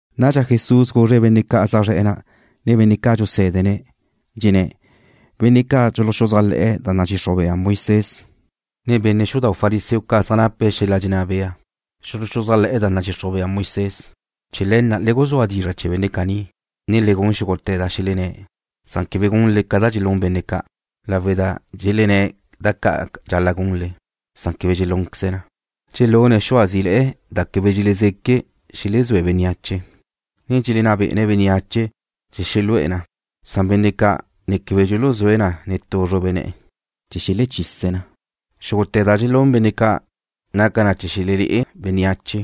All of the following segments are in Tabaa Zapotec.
Nadxa Jesús guzre̱' benne' ca' zaj zre̱'e̱ na', ne benne' ca' dxusé̱dene̱', dxenné̱': ―Benne' ca' dxuluxuzájle̱'e̱ da nadxixruj bea Moisés, ne benne' xudau' fariseo ca' zaj nape̱' xel-la' dxenná bea xuluxuzájle̱'e̱ da nadxixruj bea Moisés. Chee̱ le̱ na' le guzúa dizra' chee̱ benne' caní, ne le gun xúgute̱ da xelenné̱'. Quebe gunle ca da dxelún benne' ca', lawe' da dxelenné̱' da ca' dxal-la' gunle, na' quebe dxelúnqueze̱' na. Dxelune̱' xua zí'ile̱'e̱ da quebe dxelezeque xelezúe bénneache, ne dxelenná bé'ene̱' bénneache chee̱ xelu'e̱ na. Benne' ca' ne quebe dxuluzúe̱' na netú zrube ne̱'e̱ chee̱ da dxuluzúe benne' xubla. Xúgute̱ da dxelún benne' ca' naca na chee̱ xelelé'e bénneache.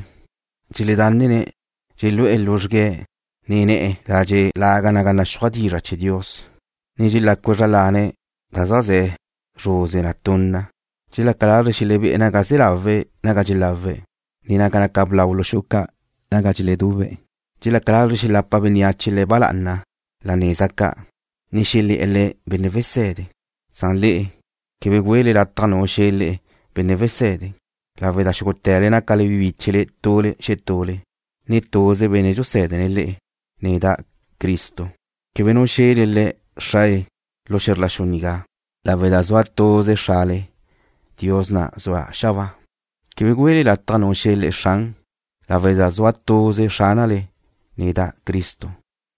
Dxeledánnene̱' dxelu'e̱ luzxgue̱', ne ne̱'e̱ ladxe' laga naga naxúaj dizra' chee̱ Dios, ne dxelácue̱' zra lane̱' da zeajzé̱ luzre na tunna. Dxelaca lazre̱' xelebé'e̱ naga ze̱ láweze naga dxelawe̱', ne naga naca blau lu xu'u ca' naga dxeledube̱'. Dxelaca lazre̱' xelapa bénneache le̱' ba lá'ana la neza ca', ne xelé̱'e̱ le̱': “Benne' wese̱de.” Na'a le'e, quebe güele lataj nu xe̱ le'e, “Benne' wesede”, lawe' da xúgute̱le nácale bi bíchele tule xetule, ne tuze Benne' dxusédene̱' le'e, neda', Cristo. Quebe nu xe̱le le'e: Xrae, lu xe̱zr la xu nigá, lawe' da zua tuze Xrale, Dios na' zue̱' xabáa. Quebe güele lataj nu xe̱ le'e: Xran, lawe' da zua tuze Xránale, neda', Cristo.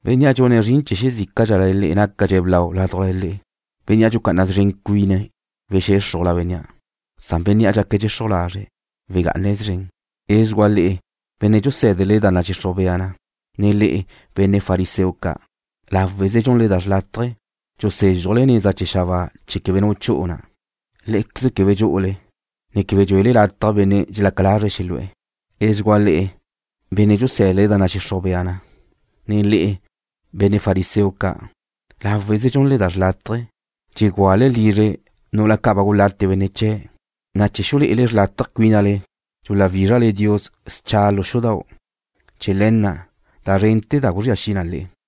Bénnea' dxune̱' zrin chee̱ xezícadxale le'e nácadxe̱' blau ládujla le'e. Bénnea' dxucá'ana szren cuine̱' wexéxrujla bénnea', na' bénnea' dxaque̱' dxexruj lazre' wegá'ane̱' szren. ’Edxugua le'e, benne' dxusé̱dele da nadxixruj bea na, ne le'e, benne' fariseo ca'. Láweze dxunle da xrlátaje. Dxusézxujle neza chee̱ xabáa chee̱ quebe nu chu'u na. Lé'equeze quebe dxú'ule, ne quebe dxuele lataj benne' dxelaca lazre̱' xelu'e̱. ’Edxugua le'e, benne' dxusé̱dele da nadxixruj bea na, ne le'e, benne' fariseo ca'. Láweze dxunle da xrlátaje. Dxegúale lizre nu'ula ca' ba gulate benne' biu chee̱', na' chee̱ xulé'ele xrlátaje cuínale, dxuwízrale Dios xcha lu xudau'. chee̱ le̱ na' da zrente̱ da guzría xi na le'e.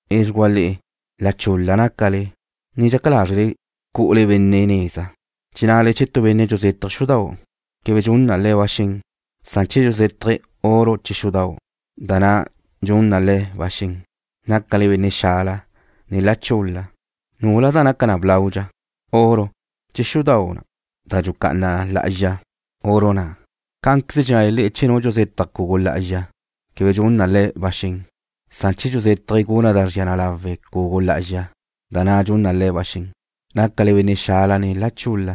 ’Edxugua le'e. La chul-la nácale, ne dxaca lázrele cu'ule benne' neza. Dxennale che tu benne' dxuzétaje̱' xudau', quebe dxun na le̱' ba xen, na' che dxuzétaje̱' oro chee̱ xudau', da na' dxun na le̱' ba xen. Nácale benne' xala, ne la chul-la. ¿Nula da naca na blaudxa, oro, che xudau' na' da dxucá'ana na lá'azxa oro na'? Cá'anqueze dxennale le'e che nu dxuzetaj cugu lá'azxa, quebe dxun na le̱' ba xen, san che dxuzétaje̱' guna' da zria na lawe' cugu lá'azxa, da na' dxun na le̱' ba xen. Nácale benne' xala ne la chul-la.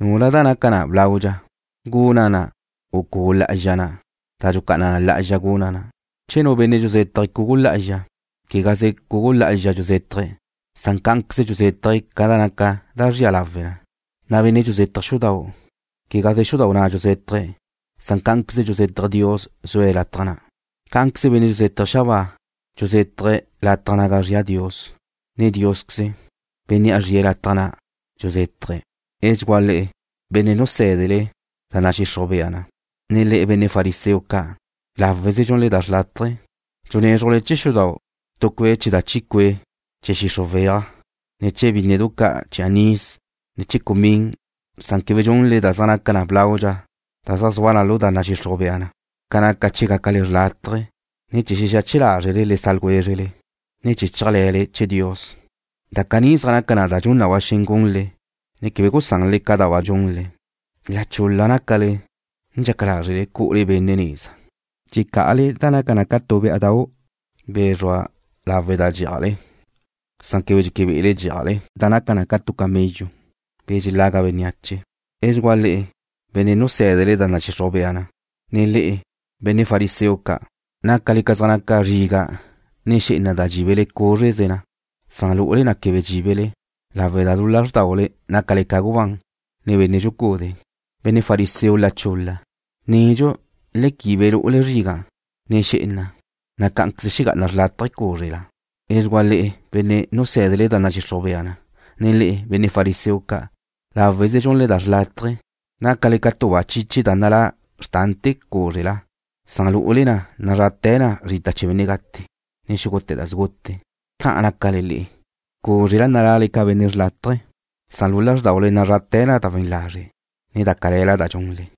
¿Nula da naca na blaudxa, guna' na', u cugu lá'azxa na' da dxucá'ana na lá'azxa guna' na'? Che nu benne' dxuzétaje̱' cugu lá'azxa, quegaze cugu lá'azxa dxuzétaje̱', san cá'anqueze dxuzétaje̱' ca naca da zria lawe na. Bénnea' dxuzétaje̱' xudau', quegaze xudau' na' dxuzétaje̱'. Cá'anqueze dxuzétaje̱' Dios zue̱' lataj na'. Cá'anqueze benne' dxuzétaje̱' xabáa, dxuzétaje̱' lataj naga zria Dios, ne Diósqueze, Bénnea' zrie̱' lataj na' dxuzétaje̱'. ’Edxugua le'e, benne' dxusé̱dele da nadxixruj bea na, ne le'e, benne' fariseo ca'. Láweze dxunle da xrlátaje. Dxunézrujle chee̱ xudau' tu cue' chee̱ da chi cue' chee̱ xixruj weaj, ne chee̱ bínnedu ca' chee̱ anís, ne chee̱ cumín. Quebe dxunle da zaj naca na blaudxa da zaj zua na lu da nadxixruj bea na, ca naca chee̱ gácale xrlátaje, ne chee̱ xexache lázrele le sa' ljwézrele, ne chee̱ chéajle̱le chee̱ Dios. Da caní zaj naca na da dxun na ba xen gunle, ne quebe gusanle da ca' ba dxunle. La chul-la nácale, ne dxaca lázrele cu'ule benne' neza. Dxecá'ale da naca ca tu bé'adau', be̱ zrua lawe' da dxí'ajle, na' quebe dxeque be'ele dxí'ajle da naca ca tu camello, be̱ dxelaga benneache. ’Edxugua le'e, benne' dxusé̱dele da nadxixruj bea na, ne le'e, benne' fariseo ca'. Láweze dxunle da xrlátaje. Nácale ca zaj naca zriga', ne xé'ena da dxíbele cúzreze na. Lu'ule na quebe dxíbele. Caní nácale lawe' da lu lázrdaule nácale ca gubán, ne benne' dxucude. Benne' fariseo la chul-la. Nedxu le quibe lu'ule zriga', ne xé'ena, na' cá'anqueze xegá'ana chawe' cúzrela. ’Edxugua le'e, benne' dxusé̱dele da nadxixruj bea na, ne le'e, benne' fariseo ca'. Láweze dxunle da xrlátaje. Nácale ca tu ba chiche da nalá na xrtante̱ cúzrela, na' lu'ule na nazrate̱ na zrita chee̱ benne' gate', ne xúgute̱ da sgute. Ca'an nácale le'e. Cúzrela nala'le ca benne' xlátaje̱, na' lu lázrdaule nazrate̱ na da we̱n lazre', ne da cale̱la da dxunle.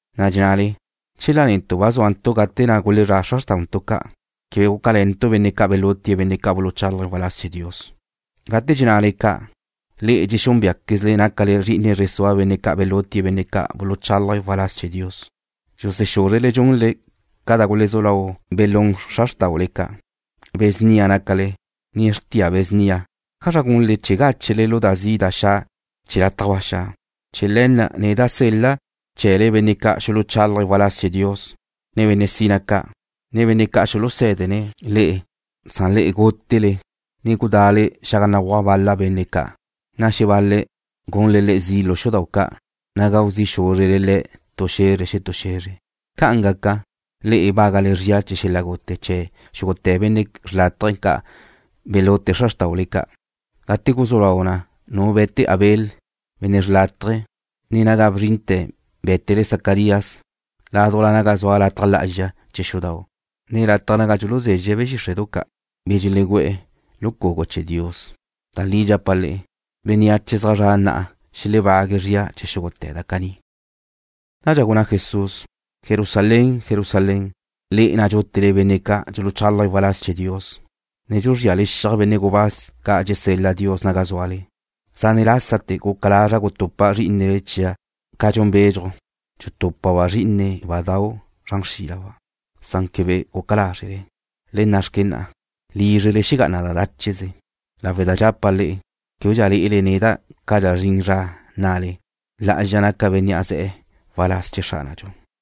Dxennale: “Chela netu' ba zúantu' gate na' gulezrá' xra xrtauntu' ca', quebe gúcale̱ntu' benne' ca' belutie̱' benne' ca' buluchálaje̱' waláz chee̱ Dios.” Gate dxennale ca', le'e dxexúnbeaquezle nácale zri'ine zre sua benne' ca' belutie̱' benne' ca' buluchálaje̱' waláz chee̱ Dios. Dxusexúzrele dxunle ca da gulezú lau belún xra xrtáule ca'. ’Be̱ snia nácale, ne xrtia be̱ snia. ¿Ájazra gunle chee̱ gáchele lu da zi' da xa' chee̱ lataj ba xa'? Chee̱ le̱ na' neda' sel-la' chee̱le benne' ca' xuluchálaje̱' waláz chee̱ Dios, ne benne' sina ca', ne benne' ca' xulusé̱dene̱' le'e. Lé'equeze gútele, ne gudá'le xaga béguaj bal-la benne' ca', na' xebal-le̱' gunle le̱' zi' lu xudau' ca', na' gau zi' xúzrele le̱' tu xe̱zre xetú xe̱zre. Ca'an gaca, le'e bágale zria chee̱ xel-la' gute chee̱ xúgute̱ benne' xrlátaje ca' belute xra xrtáule ca', gate guzú lau na nu be̱te Abel, benne' xrlátaje, ne naga bzrinte̱ bé̱tele Zacarías ládujla naga zua lataj lá'azxa chee̱ xudau' ne lataj naga dxuluzezxe̱' be̱ xíxre'du ca', be̱ dxelegú'e̱ lu cugu chee̱ Dios. Da li dxapa' le'e, bénneache zaj zre̱'e̱ na'a xelebague̱' zria chee̱ xúgute̱ da caní. Nadxa gunná Jesús: ―Jerusalén, Jerusalén, le'e na' dxútele benne' ca' dxuluchálaje̱' waláz chee̱ Dios, ne dxuzríale xiaj benne' gubáz ca' dxesel-la Dios naga zúale. Zane' lásate̱ guca lazra' gutupa' zrí'inele chia' ca dxun bedxuj, dxutúpaba' be dxé'enedau' zran xrílaba', san quebe guca lázrele. Le nna'xque na'a, lízrele xelexegá'ana na dácheze, lawe' da dxapa' le'e, québedxa lé'ele neda' cadxa zrin zra nnale: La'azxa naca bénnea' ze̱'e̱ waláz chee̱ Xránadxu.